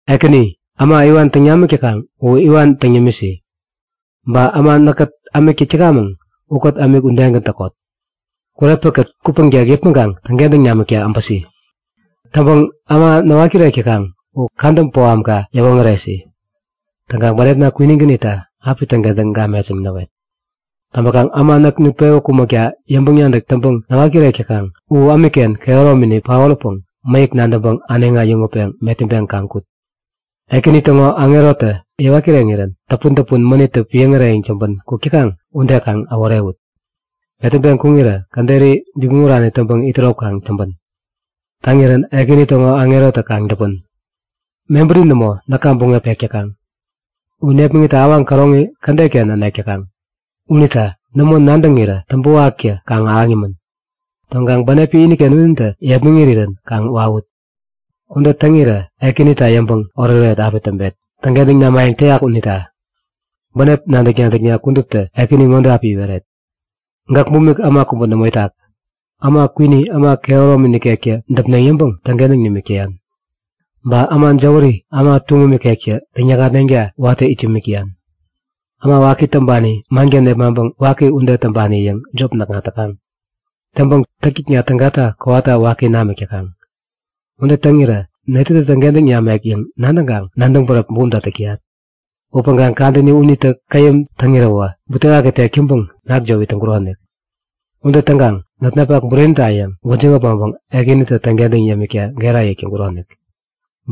Ekäni, äma iwan täŋ namik täkaŋ u iwan täŋ yämisi. Ba äma näkkät ämik täk täkamäŋ ukät ämik udegän täkot! Kurepäkät kupäŋtek yäpmäŋkaŋ täŋkentäŋ namikta äbäsi. Täŋpäŋ äma näwat kirek täkaŋ u kadä bohamka yäwoŋäresi. Täŋkaŋ bänepna kwinigän itta api täŋkentäŋ gamet yäŋ näwet. Täŋpäkaŋ äma näk nutpewä kumäkta yäŋpäŋ-nadäk täŋpäŋ näwat-kirek täkaŋ u ämikken kehäromini paoräpäŋ mäyäk nadäŋpäŋ äneŋi äyäŋutpäŋ metäŋpeŋ kaŋ kut! Ekäni täŋo aŋerotä yäwat kireŋirän täpun-täpun mänittä piäŋ äreyäŋ täŋpän kuk täkaŋ ude kaŋ äworewut. Metäŋpeŋ kuŋirä käderi bipmäŋ urani täŋpäŋ itärop kaŋ täŋpän. Täŋirän Ekäni täŋo aŋerotä kaŋ däpän! Mebäri nämo näka buŋep pek täkaŋ. U nepmäŋitta awaŋ käroŋi kädetnaken änek täkaŋ. Unita nämo nadäŋirä täŋpäwaktä kaŋ ahäŋ yämän. Täŋkaŋ buŋepi iniken unitä yepmäŋ irirän kaŋ wawut! Ude täŋirä Ekänita yäŋpäŋ oretoret api täŋpet, täŋkentäŋ namayäŋ täyak unita. Bänep nadäk-nadäkna kuduptä Ekäni ŋode api iweret; Gäk bumik äma kubä nämo itak. Äma kwini äma kehäromi nikektä däpneŋ yäŋpäŋ täŋkentäŋ yämik täyan. Ba äma jäwäri äma tuŋum ikektä täŋyäkŋatneŋta watä it yämik täyan. Äma waki täŋpani manken nepmaŋpäŋ waki ude täŋpani yäŋ jop näkŋat täkaŋ. Täŋpäŋ täktäkna tägata kowata waki namik täkaŋ. Ude täŋirä netätä täŋkentäŋ namek yäŋ nadäŋkaŋ nadäŋ bäräp bumta täk täyat. Upäŋkaŋ kadäni unitä käyäm täŋiräwä, butewaki tek täŋpäŋ nakjop it täŋkuronik. Ude täŋkaŋ notnapak burenita yäŋ gwäjiŋ äpmoŋpäŋ Ekänitä täŋkentäŋ yämikta gera yäk täŋkuronik.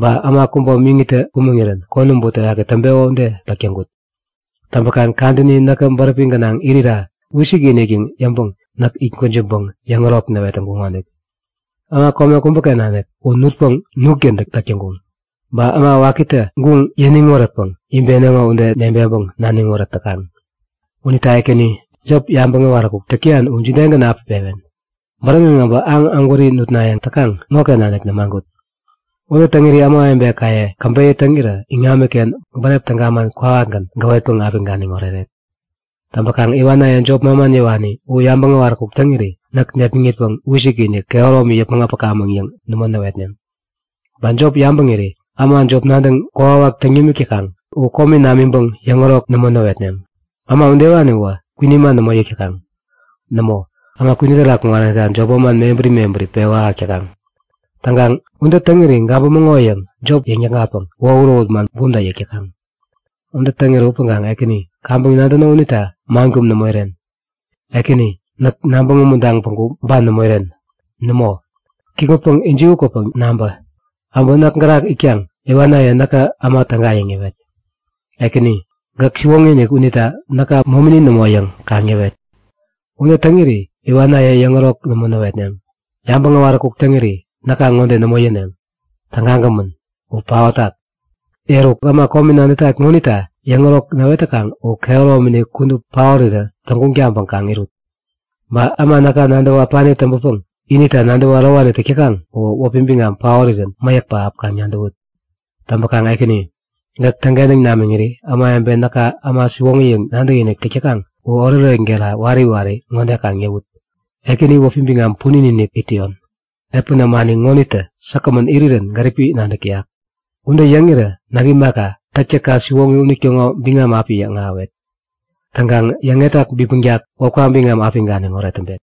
Ba äma kubä miŋitä kumäŋirän konäm butewaki täŋpeko ude täk täŋkut. Täŋpäkaŋ kadäni näkä bäräpi gänaŋ irira wisik-inik yäŋ yäŋpäŋ näk it gwäjiŋpäŋ yäŋärok näwet täŋkuŋonik. Äma kome kubäken nanik u nutpäŋ nutgän täk täŋkuŋ. Ba äma wakitä guŋ yäniŋ wärätpäŋ ibeneŋo ude nebeŋpäŋ naniŋ wärät täkaŋ. Unita Ekäni jop yabäŋ äwaräkuk täk täyan u jidegän api pewen? Bäräŋeŋ äbä aŋ ägwäri nutnayäŋ täkaŋ ŋoken nanik nämagut! Ude täŋiri ämawebekaye käbeyä täŋirä iŋamiken bänep täga man kwawakgän gäwetpäŋ api ganiŋ oreret. Täŋpäkaŋ iwanaye jop manman yäwani u yabäŋ äwaräkuk täŋiri näk närepmitpäŋ wisik-inik, kehäromini yäpmäŋ äpakamäŋ yäŋ nämo näwetneŋ. Ba jop yabäŋiri äma jop nadäŋ kokwawak täŋ namik täkaŋ u komi namiŋpäŋ yäŋärok nämo näwetneŋ. Äma udewani uwä kwini man nämo yäk täkaŋ. Nämo, u äma kwini terak kuŋaranita jop manman mebäri mebäri pewä ahäk täkaŋ. Täŋkaŋ, ude täŋiri gabämäŋo yäŋ jop yäŋnäkŋatpäŋ wohut-wohut man bumta yäk täkaŋ. Ude täŋirä upäŋkaŋ Ekäni, kaŋpäŋ nadäno unita man kum nämo iren. Ekäni, näk nabäŋ umuntaŋ päŋku ban nämo iren. Nämo! Kikŋutpäŋ ijiwä kwäpäŋ nabä! Äbä näk gärak itkaŋ iwanaye näka äma täga yäŋ yäwet! Ekäni, gäk siwoŋi-inik unita näka momini nämo yäŋ kaŋ yäwet. Ude täŋiri iwanaye yäŋärok nämo näwetneŋ. Yabäŋ äwaräkuk täŋiri näka ŋode nämo yäneŋ; Tägagämän! U paotak! Eruk, äma komi nadätat ŋonita yäŋärok näwet täkaŋ u kehäromini kudup paorirä täŋguŋ taŋpäŋ kaŋ irut! Ba äma näka nadäwä äpani täŋpäpäŋ inita nadäwä ärowani täk täkaŋ uwä wäpi biŋam paorirän mäyäk pähap kaŋ nadäwut. Täŋpäkaŋ Ekäni, gäk täŋkentäŋ namiŋiri ämawebe näka äma siwoŋi yäŋ nadäkinik täk täkaŋ u oretoret gera wari wari ŋode kaŋ yäwut; Ekäni wäpi biŋam punin-inik it täyon! Epän ämani ŋonitä säkgämän irirän gäripi nadäk täyak. Ude yäŋirä näk imaka, täktäkka siwoŋi unitäŋo biŋam api yäŋahäwet. Täŋkaŋ yäŋetak bipmäŋtak wäpka biŋam api ganiŋoret täŋpet.